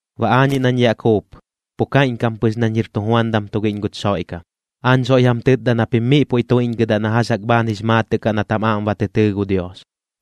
Baꞌ aañiꞌ nañ yaꞌ kuup, pu kaiꞌñkam pɨx nañ jir tujuandam tugiꞌñ guch Xoiꞌkam. Aañ soiꞌñ jam tɨtda na pim miꞌ puiꞌ tuiꞌñgɨdaꞌ na jax jaꞌk bhaan jix maatɨꞌ kaꞌ nat jam aꞌm ba tɨ tɨɨ gu Dios,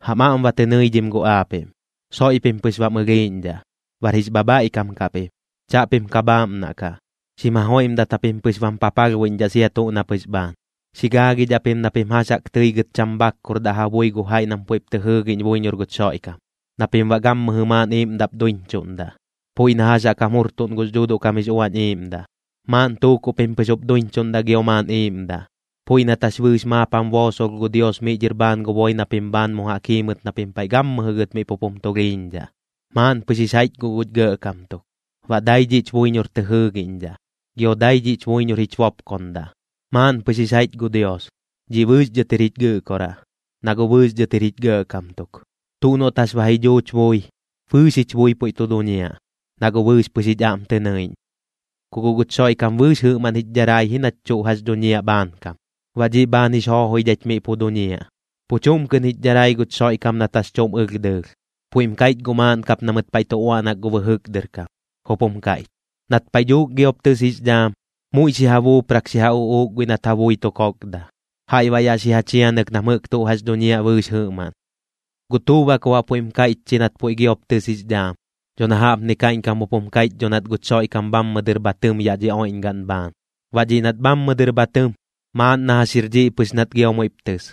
jam aꞌm ba tɨ nɨidhim guꞌ aapiꞌm. Soiꞌ pim pɨx bam ɨlhiiꞌñdhaꞌ, bar jix bhabhaiꞌkam kaꞌ pim, chaꞌpim ka bhaaꞌmnaꞌ kaꞌ, xim jajoiꞌmdat japim pɨx bam papalhbuiꞌñdhaꞌ sia tuꞌ na pɨx bhaan. Xi gaagidhaꞌ pim na pim jax jaꞌk tɨi gɨt cham bhakkurdaꞌ ja bui gu jaiꞌ nam puiꞌp tɨ jɨɨgiꞌñ buiñor guch Xoiꞌkam, na pim baꞌ gammɨjɨ maaꞌn iiꞌmdaꞌp duiñchuꞌndaꞌ, puiꞌ na jax jaꞌk jam jurtuꞌn gux Dhuuduꞌ kam jix Uañ Iiꞌmdaꞌ. Maaꞌn tuukuꞌ pim pɨx jup duiñchuꞌndaꞌ gio maaꞌn iiꞌmdaꞌ, puiꞌ nat jax bɨɨx maap jam boosolh gu Dios miꞌ dhɨr bhaan gu boi na pim bhaan mu jaꞌk jiimɨt na pim paiꞌ gammɨjɨ gɨt miꞌ pup jum tulhiiñdhaꞌ. Maaꞌn pɨx jix jaiꞌch guꞌ guch Gɇꞌkam tuk, baꞌ dai dhiꞌch buiñor tɨ jɨɨgiꞌñdhaꞌ, gio dai dhiꞌch buiñor jich bopkondaꞌ. Maaꞌn pɨx jix jaiꞌch gu Dios, dhiꞌ bɨɨx dhɨt jir jich Gɨꞌkoraꞌ, na guꞌ bɨɨx dhɨt jir jich Gɇꞌkam tuk. Tuꞌ noꞌt jax ba ji dhuuch bui, bɨɨx jich bui puiꞌ tu duñiaꞌ, na guꞌ bɨɨx pɨx jich aꞌm tɨ nɨiꞌñ. Ku guꞌ guch Xoiꞌkam bɨɨx jɨꞌmaꞌn jich dharai ji nach tuꞌ jax dhuñiaꞌ bhaankam, baꞌ dhiꞌ bhaan jix joojoidhaich miꞌ pu duñiaꞌ. Pu chuꞌm kɨꞌn jich dharai guch Xoiꞌkam nat jax chuꞌm ɨlh dɨɨlh, puiꞌm kaiꞌch guꞌ maaꞌn kap na mɨt paiꞌ tu uaꞌnak gu bɨjɨk dɨr kam, jup jum kaiꞌch: Nat paiꞌ dhuuk giop tɨs jix dhaam, muiꞌ xi ja buuprak xi ja uꞌuuk guiꞌ nat ja bui tu kokda, jaiꞌ baꞌ yaꞌ xi ja chianɨk nam jɨꞌk tuꞌ jax dhuñiaꞌ bɨɨx jɨꞌmaꞌn. ¿Guꞌ tuꞌ baꞌ ku baꞌ puiꞌm kaiꞌch chi nat puiꞌ giop tɨs jix dhaam? Dho na jaꞌpni kaiꞌñkam jup jum kaiꞌch dho nat guch Xoiꞌkam bhammɨ dɨr bha tɨm yaꞌ dhi oiꞌñgaꞌn bhaan. Baꞌ dhiꞌ nat bhammɨ dɨr bha tɨm, maaꞌn na jax jir dhiꞌ pɨx nat gio muiꞌp tɨs.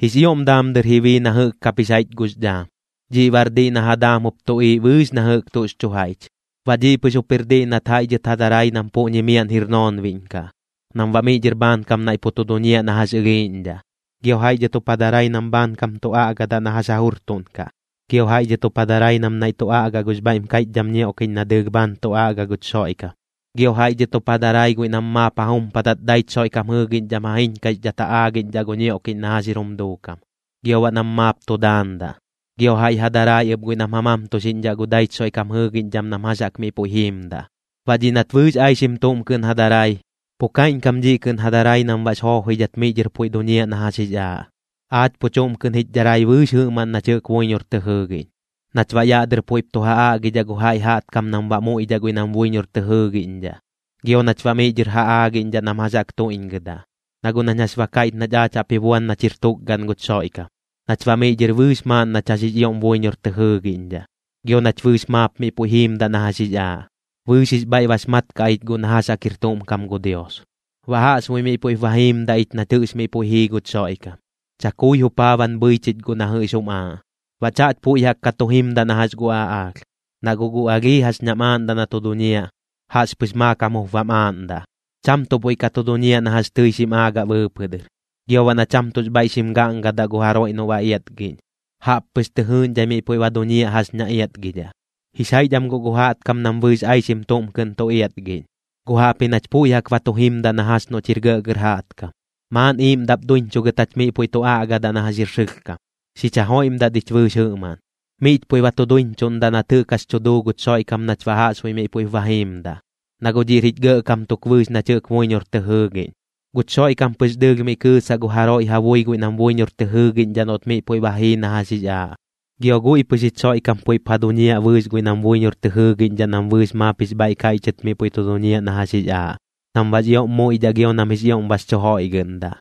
Jix ioꞌm daam dɨr ji bii na jɨꞌk kap jix jaiꞌch gux dhaam. Dhiꞌ baꞌr diꞌ na ja daam jup tuꞌiiꞌ bɨɨx na jɨꞌk tuꞌx chu jaiꞌch. Baꞌ dhiꞌ pɨx jup jir diꞌ nat jaiꞌ dhɨt ja darai nam puꞌñi miaꞌn jir noonbiꞌñ kaꞌ, nam baꞌ miꞌ dhɨr bhaankam naiꞌ pu tu duñiaꞌ na jax ɨlhiiꞌñdhaꞌ. Gio jaiꞌ dhɨt jup ja darai nam bhaankam tu aꞌgadaꞌ na jax ja jurtuꞌnkaꞌ. Gio jaiꞌ dhɨt jup ja darai nam nai tu aꞌgaꞌ gux bhaiꞌm kaiꞌchdham ñioꞌkiꞌñ na dɨɨlh bhaan tu aꞌga guch Xoiꞌkam. Gio jaiꞌ dhɨt jup ja darai guiꞌ nam maap ja jumpadat daich Xoiꞌkam jɨɨgiꞌñdham ja jiñkaixdhat ja aagiꞌñdhaꞌ gu ñioꞌkiꞌñ na jax jir jum duukam, gio baꞌ nam maap tu daandaꞌ. Gio jaiꞌ ja darai ɨp guiꞌ nam ja mamtuxiꞌñdhaꞌ gu daich Xoiꞌkam jɨɨgiꞌñdham nam jax jaꞌk miꞌ puiꞌ jiimdaꞌ. Baꞌ dhiꞌ nat bɨɨx aixim tuꞌm kɨꞌn ja darai, pu kaiꞌñkam dhiꞌ kɨꞌn ja darai nam baꞌx joojoidhat miꞌ dhɨr puiꞌ duñiaꞌ na jax jix aaꞌ. Aach pu chuꞌm kɨꞌn jich dharai bɨɨx jɨꞌmaꞌn nach jɨꞌk buiñor tɨ jɨɨgiꞌñ, nach baꞌ yaꞌ dɨr puiꞌp tu ja aꞌgidhaꞌ gu jaiꞌ jaꞌtkam nam baꞌ muiꞌdhaꞌ guiꞌ nam buiñor tɨ jɨɨgiꞌñdhaꞌ, gio nach baꞌ miꞌ dhɨr ja aagiꞌñdhaꞌ nam jax jaꞌk tuiꞌñgɨdaꞌ. Na guꞌ nañ jax ba kaiꞌch nach aach jaꞌp ji buan nach jir tukgaꞌn guch Xoiꞌkam, nach baꞌ miꞌ dhɨr bɨɨx maaꞌn nach jax jix ioꞌm buiñor tɨ jɨɨgiꞌñdhaꞌ, gio nach bɨɨx maap miꞌ puiꞌ jiimdaꞌ na jax jix aaꞌ, bɨɨx jix bhaiꞌ bax mat kaꞌ ich guꞌ na jax jaꞌk jir tuꞌm kam gu Dios. Baꞌ jaꞌxbuiꞌ miꞌ puiꞌp ba jiimdaꞌ ich nat jɨꞌx miꞌ puiꞌ jii guch Xoiꞌkam, chakui jupaaban bhɨi chich guꞌ na jɨꞌx jum aaꞌ. Baꞌ chaꞌch puiꞌ jaꞌk ka tu jimdaꞌ na jax gu aꞌaalh. Na guꞌ gu alhii jax ñam aaꞌndaꞌ na tu duñiaꞌ, jaꞌxpɨx maakam jup bam aaꞌndaꞌ, cham tuꞌ puiꞌ ka tu duñiaꞌ na jax tɨi xim aagaꞌ bɨɨpɨꞌ dɨr. Gio baꞌ na cham tuꞌx bhaiꞌ xim gaꞌngadaꞌ gu jaroiꞌ noꞌ ba iatgiꞌñ, jaꞌp pɨx tɨ jɨɨꞌñdhai miꞌ puiꞌ ba duñiaꞌ jax ña iatgidhaꞌ. Jix jaiꞌch am guꞌ gu jaꞌtkam nam bɨɨx aixim tuꞌm kɨꞌn tu iatgiꞌñ, guꞌ jaꞌpji nach puiꞌ jaꞌk ba tu jimdaꞌ na jax noꞌch jir gɇꞌgɇr jaꞌtkam. Maaꞌn iiꞌmdaꞌp duiñchugɨt jach miꞌ puiꞌ tu aꞌgadaꞌ na jax jir sɨlhkam, xich jajoiꞌmdat ich bɨɨx jɨꞌmaꞌn. Miꞌch puiꞌ ba tu duiñchuꞌndaꞌ nat jɨꞌk jax tu duu guch Xoiꞌkam nach baꞌ jaꞌxbuiꞌ miꞌ puiꞌp ba jiimdaꞌ, na guꞌ dhiꞌr jich Gɇꞌkam tuk bɨɨx nach jɨꞌk buiñor tɨ jɨɨgiꞌñ. Guch Xoiꞌkam pɨx dɨɨlh miꞌ kɨɨsaꞌ gu jaroiꞌ ja bui guiꞌ nam buiñor tɨ jɨɨgiꞌñdhaꞌ noꞌt miꞌ puiꞌ ba jii na jax jix aaꞌ. Gio guiꞌ pɨx jich Xoiꞌkam puiꞌp ja duñiaꞌ bɨɨx guiꞌ nam buiñor tɨ jɨɨgiꞌñdhaꞌ nam bɨɨx maap jix bhaiꞌ kaiꞌchɨt miꞌ puiꞌ tu duñiaꞌ na jax jix aaꞌ, nam baꞌx ioꞌm muiꞌdhaꞌ gio nam jix ioꞌm bax chu joiꞌgɨꞌndaꞌ.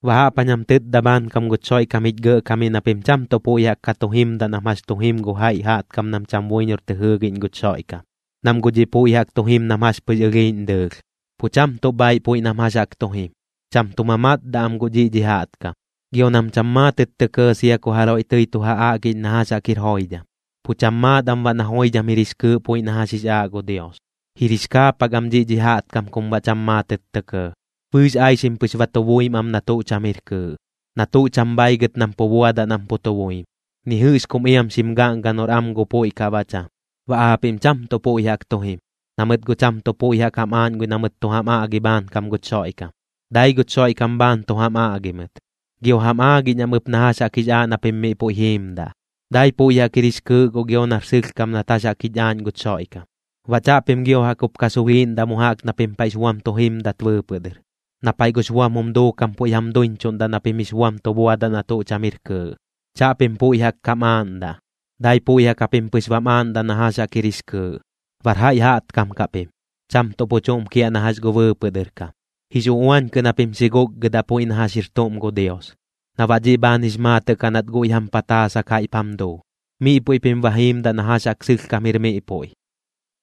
Baꞌ jaꞌp jañ jam tɨtda bhaankam guch Xoiꞌkam jich Gɇꞌkamiꞌ na pim cham tuꞌ puiꞌ jaꞌk ka tu jimdaꞌ nam jax chu jim gu jaiꞌ jaꞌtkam nam cham buiñor tɨ jɨɨgiꞌñ guch Xoiꞌkam, nam guꞌ dhiꞌ puiꞌ jaꞌk tu jim nam jax pɨx ɨlhiiꞌñ dɨɨlh, pu cham tuꞌ bhaiꞌ puiꞌ nam jax jaꞌk tu jim. Cham tu mamatdaꞌ am guꞌ dhiꞌ dhi jaꞌtkam, gio nam cham maatɨt tɇ kɇɇ sia ku jaroiꞌ tɨi tu ja aꞌgiꞌñ na jax jaꞌk jir joidham, pu cham maat am baꞌ na joidham jir jix kɨɨꞌ puiꞌ na jax jix aaꞌ gu Dios. Jir jix kaapak am dhiꞌ dhi jaꞌtkam kum baꞌ cham maatɨt tɇ kɇɇ, bɨɨx aixim pɨx ba tu buim am na tuꞌ cham jir kɨɨꞌ, na tuꞌ cham bhaigɨt nam pu buadaꞌ nam pu tu buim. Ni jɨꞌx kum iam xim gaꞌngaꞌ noꞌr am gu puiꞌ kaꞌ baꞌ cham. Baꞌ aapiꞌm cham tuꞌ puiꞌ jaꞌk tu jim, na mɨt guꞌ cham tuꞌ puiꞌ jaꞌk jam aaꞌñ guiꞌ na mɨt tu jam aꞌgi bhaankam guch Xoiꞌkam. Dai guch Xoiꞌkam bhaan tu jam aꞌgi mɨt, gio jam aagiꞌñ am ɨp na jax jaꞌk jix aaꞌ na pim miꞌ puiꞌ jiimdaꞌ. Dai puiꞌ jaꞌk jir jix kɨɨꞌ guꞌ gio nar sɨlhkam nat jax jaꞌk jich aaꞌñ guch Xoiꞌkam. Baꞌ chaꞌpim gio jaꞌk jup ka sulhiiꞌndaꞌ mu jaꞌk na pim paiꞌx buam tu jimdat bɨɨpɨꞌ dɨr, na paiꞌ gux buam jum duukam puiꞌ jam duiñchuꞌndaꞌ na pim jix buam tu buadaꞌ na tuꞌ cham jir kɨɨꞌ. Chaꞌpim puiꞌ jaꞌk kam aaꞌndaꞌ, dai puiꞌ jaꞌk japim pɨx bam aaꞌndaꞌ na jax jaꞌk jir jix kɨɨꞌ. Bar jaiꞌ jaꞌtkam kaꞌ pim, cham tuꞌ pu chuꞌm kiaꞌ na jax gu bɨɨpɨꞌ dɨr kam. Jix uꞌuañ kɨꞌn japim xi guꞌkgɨdaꞌ puiꞌ na jax jir tuꞌm gu Dios, na baꞌ dhiꞌ bhaan jix maatɨꞌ kaꞌ nat guiꞌ jam pataasak jaiꞌp jam duu. Miꞌ puiꞌ pim ba jiimdaꞌ na jax jaꞌk sɨlhkam jir miꞌ puiꞌ.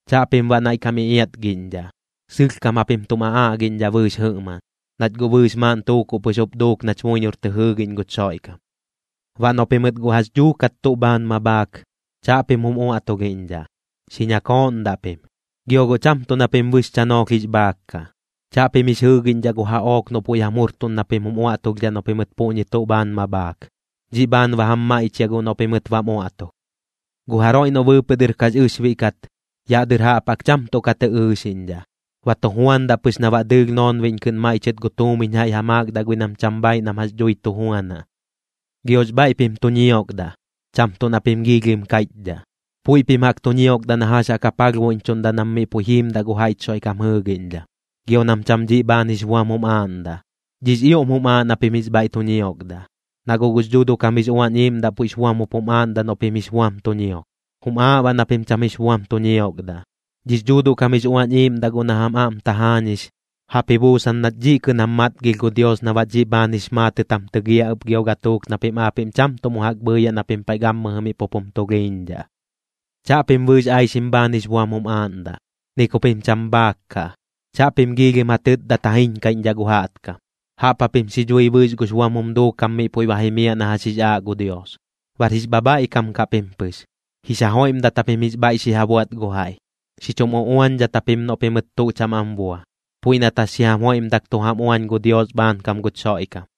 Chaꞌpim baꞌ naiꞌ kam iꞌiatgiꞌñdhaꞌ, sɨlhkam japim tum aꞌaꞌgiꞌñdhaꞌ bɨɨx jɨꞌmaꞌn, nach guꞌ bɨɨx maaꞌn tuukuꞌ pɨx jup duuk nach buiñor tɨ jɨɨgiꞌñ guch Xoiꞌkam. Baꞌ noꞌ pimɨt guꞌ jax dhuukat tuꞌ bhaan ma bhaak, chaꞌpim jum uaꞌtulhiꞌñdhaꞌ, xi ñakooꞌndaꞌ pim, gio guꞌ cham tuꞌ na pim bɨx chanoolh jix bhaak kaꞌ. Chaꞌpim jix jɨɨgiꞌñdhaꞌ gu jaꞌook noꞌ puiꞌ jam jurtuꞌn na pim jum uaꞌtulhdhaꞌ noꞌ pimɨt puꞌñi tuꞌ bhaan ma bhaak. Dhiꞌ bhaan ba jam maiꞌchiaꞌ guꞌ noꞌ pimɨt bam uaꞌtulh. Gu jaroiꞌ noꞌ bɨɨpɨꞌ dɨr kax ɨxbiꞌ kat, yaꞌ dɨr jaꞌp jaꞌk cham tuꞌ ka tɨ ɨɨxiꞌñdhaꞌ. Ba tu juandaꞌ pɨx na baꞌ dɨɨlh noonbiꞌñ kɨꞌn maiꞌchɨt gu tuumiñ jaiꞌ ja maakdaꞌ guiꞌ nam cham bhaaiꞌ nam jax dhui tu juanaꞌ. Giox bhaiꞌ pim tu ñiokdaꞌ, cham tuꞌ na pim giilhim kaiꞌchdhaꞌ. Puiꞌ pim jaꞌk tu ñiokdaꞌ na jax jaꞌk ja palhbuiꞌñchuꞌndaꞌ nam miꞌ puiꞌ jiimdaꞌ gu jaiꞌch Xoiꞌkam jɨɨgiꞌñdham, gio nam cham dhiꞌ bhaan jix buam jum aaꞌndaꞌ. Dhiꞌx ioꞌm jum aaꞌ na pim jix bhaiꞌ tu ñiokdaꞌ, na guꞌ gux Dhuuduꞌ kam jix Uañ Iiꞌmdaꞌ puiꞌx buam jup jum aaꞌndaꞌ noꞌ pim jix buam tu ñiok. Jum aaꞌ baꞌ na pim cham jix buam tu ñiokdaꞌ. Dhix Dhuuduꞌ kam jix Uañ Iiꞌmdaꞌ guꞌ na jam aꞌm tajaañix, jaꞌp ji buusan nat dhiꞌ kɨꞌn jam matgilh gu Dios na baꞌ dhiꞌ bhaan jix maatɨt jam tɨgiaꞌ ɨp gio gatuuk na pim aapiꞌm cham tuꞌ mu jaꞌk bhɨɨyaꞌ na pim paiꞌ gammɨjɨ miꞌ pup jum tulhiiñdhaꞌ. Chaꞌpim bɨɨx aixim bhaan jix buam jum aaꞌndaꞌ, ni ku pim cham bhaak kaꞌ. Chaꞌpim giilhim ja tɨtdat ja jiñkaiꞌñdhaꞌ gu jaꞌtkam. Jaꞌp japim xi dhui bɨɨx gux buam jum duukam miꞌ puiꞌ ba jimiaꞌ na jax jix aaꞌ gu Dios. Bar jix bhabhaiꞌkam kaꞌ pim pɨx, jix ja joiꞌmdat japim jix bhaiꞌ xi ja buaꞌt gu jaiꞌ. Xi chum uꞌuañdhat japim noꞌ pimɨt tuꞌ cham am bua, puiꞌ nat jax xi jam joiꞌmdak tu jam uañ gu Dios bhaankam guch Xoiꞌkam.